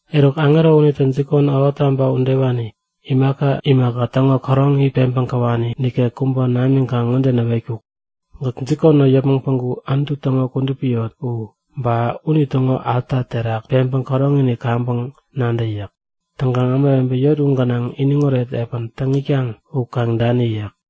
Eruk, aŋero unitä jikon, ähottaba udewani, imaka imaka täŋo käroŋini peŋpäŋ käwani nikek kubä namiŋkaŋ ŋode näwetkuk; Gäk jikon ŋo yäpmäŋ päŋku Anutu täŋo kudupi yot u, ba unitäŋo alta terak peŋpäŋ käroŋini kaŋpäŋ nadä yäk. Täŋkaŋ ämawebe yot u gänaŋ iniŋoret epän täŋ itkaŋ u kaŋ dani yäk.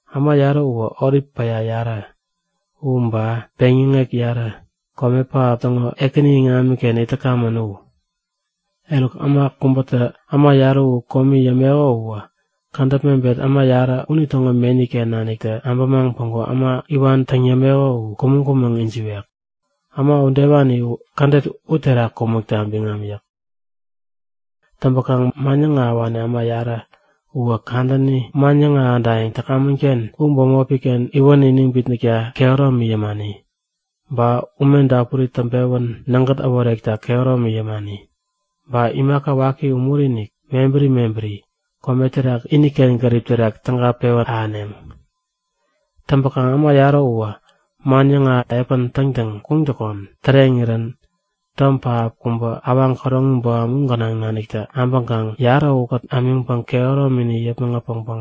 Äma yarä uwä olip päya yarä u, ba peŋyäŋek yarä, kome pähap täŋo Ekäni iŋamiken it täkamän u. Eruk, äma kubätä äma yarä u komi yämeko uwä kädäp mebet äma yarä unitäŋo meni-ken naniktä abämaŋ päŋku äma iwan täŋ yämeko u kumäŋ-kumäŋ ijiwek. Äma udewani kädet uterak kumäkta biŋam yäk. Täŋpäkaŋ man yäŋahäwani äma yarä uwä kadäni man yäŋahädayäŋ täkamän-ken u bämopi-ken iwän iniŋ bitnäkta kehäromi yämani. Ba ume dapuri täŋpewän nägät äworekta kehäromi yämani. Ba imaka waki umuri-inik mebäri mebäri kome terak iniken gärip terak täga pewän ahäneŋ. Täŋpäkaŋ äma yarä uwä man yäŋahäk epän täŋtäŋ kuŋattäkon täreŋirän, tom pähap kubä, awaŋ käroŋi boham u gänaŋ nanik abäŋkaŋ yarä ukät ämiŋpäŋ kehäromini yäpmäŋ äpäŋpäŋ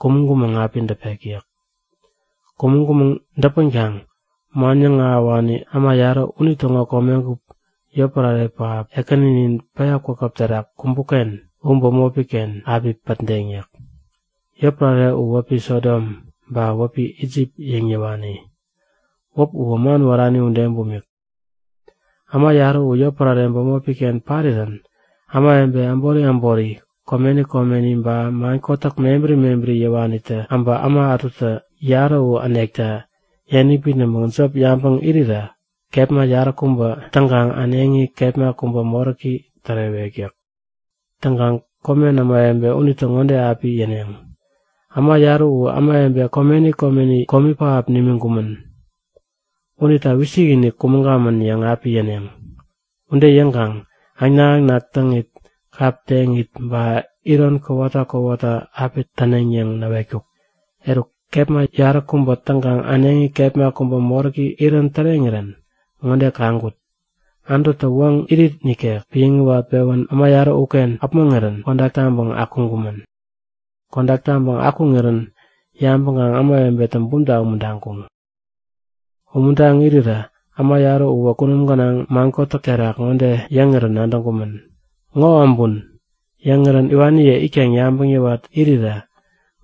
kumäŋ-kumäŋ api däpek yäk. Kumäŋ-kumäŋ däpänkaŋ man yäŋahäwani äma yarä unitäŋo komegup yotpärare pähap, Ekänini päya kwakäp terak kumbuk-ken u bämopi-ken api pätdeŋ yäk. Yotpärare u wäpi Sodom, ba wäpi Isip yäŋ yäwani. Wäp uwä man wärani ude bumik. Äma yarä u yotpärare bämopi-ken parirän ämawebe äbori äbori, komeni komeni ba man kotäk mebäri mebäri yäwanitä äbä äma ätutä yarä u änekta yäniŋ bitnäŋpäŋ jop yabäŋ irirä kepma yaräkubä täŋkaŋ äneŋi kepma kubä moräki tärewek yäk. Täŋkaŋ komen ämawebe unitä ŋode api yäneŋ; Äma yarä u ämawebe komeni komeni komi pähap nimiŋkumän. Unita wisikinik kumäŋkamän yäŋ api yäneŋ. Ude yäŋkaŋ äŋnak-äŋnak täŋit kap teŋit ba iron kowata kowata api täneŋ yäŋ näwetkuk. Eruk, kepma yaräkubä täŋkaŋ äneŋi kepma kubä moräki irän täreŋirän ŋode kaŋkut; Anututä woŋ irit nikek piäŋpewän äma yarä uken äpmoŋirän kodak taŋpäŋ akuŋkumän. Kodak taŋpäŋ akuŋirän yabäŋkaŋ ämawebe bumta umuntaŋkuŋ. Umuntaŋ irirä äma yarä uwä kunum gänaŋ man kotäk gera terak ŋode yäŋirän nadäŋkumän; Ŋo abun! Yäŋirän iwaniye itkaŋ yabäŋ yäwat irirä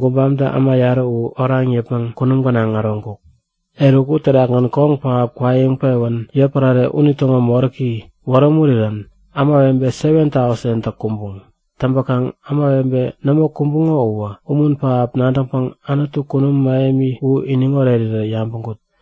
gubamtä äma yarä u oraŋ yäpmäŋ kunum gänaŋ äroŋkuk. Eruk, uterakgän koŋ pähap kwaiŋpewän yotpärare unitäŋo moräki awähurirän ämawebe 7,000tä kumbuŋ. Täŋpäkaŋ ämawebe nämo kumbuŋo uwä umun pähap nadäŋpäŋ Anutu kunum mähemi u iniŋ orerirä yabäŋkut.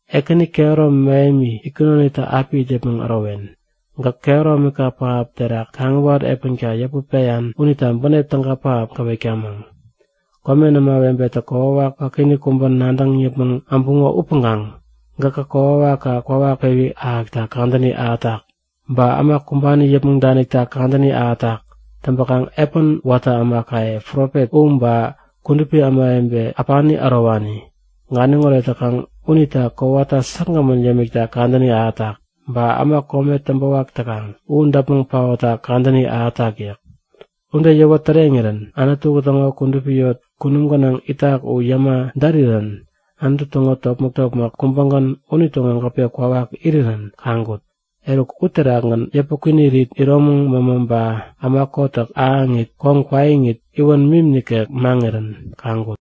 Ekäni, kehäromi mähemi, itkunonitä api it yäpmäŋ ärowen. Gäk kehäromika pähap terak kaŋiwat epänka yäput peyan unita bänep täga pähap gäwetkamäŋ. Komen ämawebetä kokwawak wakiinik kubä nadäŋ yäpmäŋ äbuŋo upäŋkaŋ gäkŋa kokwawakka kwawak pewi ahäkta kadäni ahätak. Ba äma kumbani yäpmäŋ danikta kadäni ahätak. Täŋpäkaŋ epän watä ämakaye profet u, ba kudupi ämawebe äpani ärowani, ganiŋoret täkaŋ unita kowata säkgämän yämikta kadäni ahätak. Ba äma kome täŋpäwak täkaŋ u däpmäŋ paotta kadäni ahätak yäk. Ude yäwä täreŋirän Anutu täŋo kudupi yot kunum gänaŋ itak u yäma därirän Anutu täŋo topmäk-topmäk kubägän unitäŋo gäpe kwawak irirän kaŋkut. Eruk uterakgän yäpä kwinirit, iromäŋ mämä ba äma kotäk ahäŋit, koŋ kwaiŋit, iwän mim nikek maŋirän kaŋkut.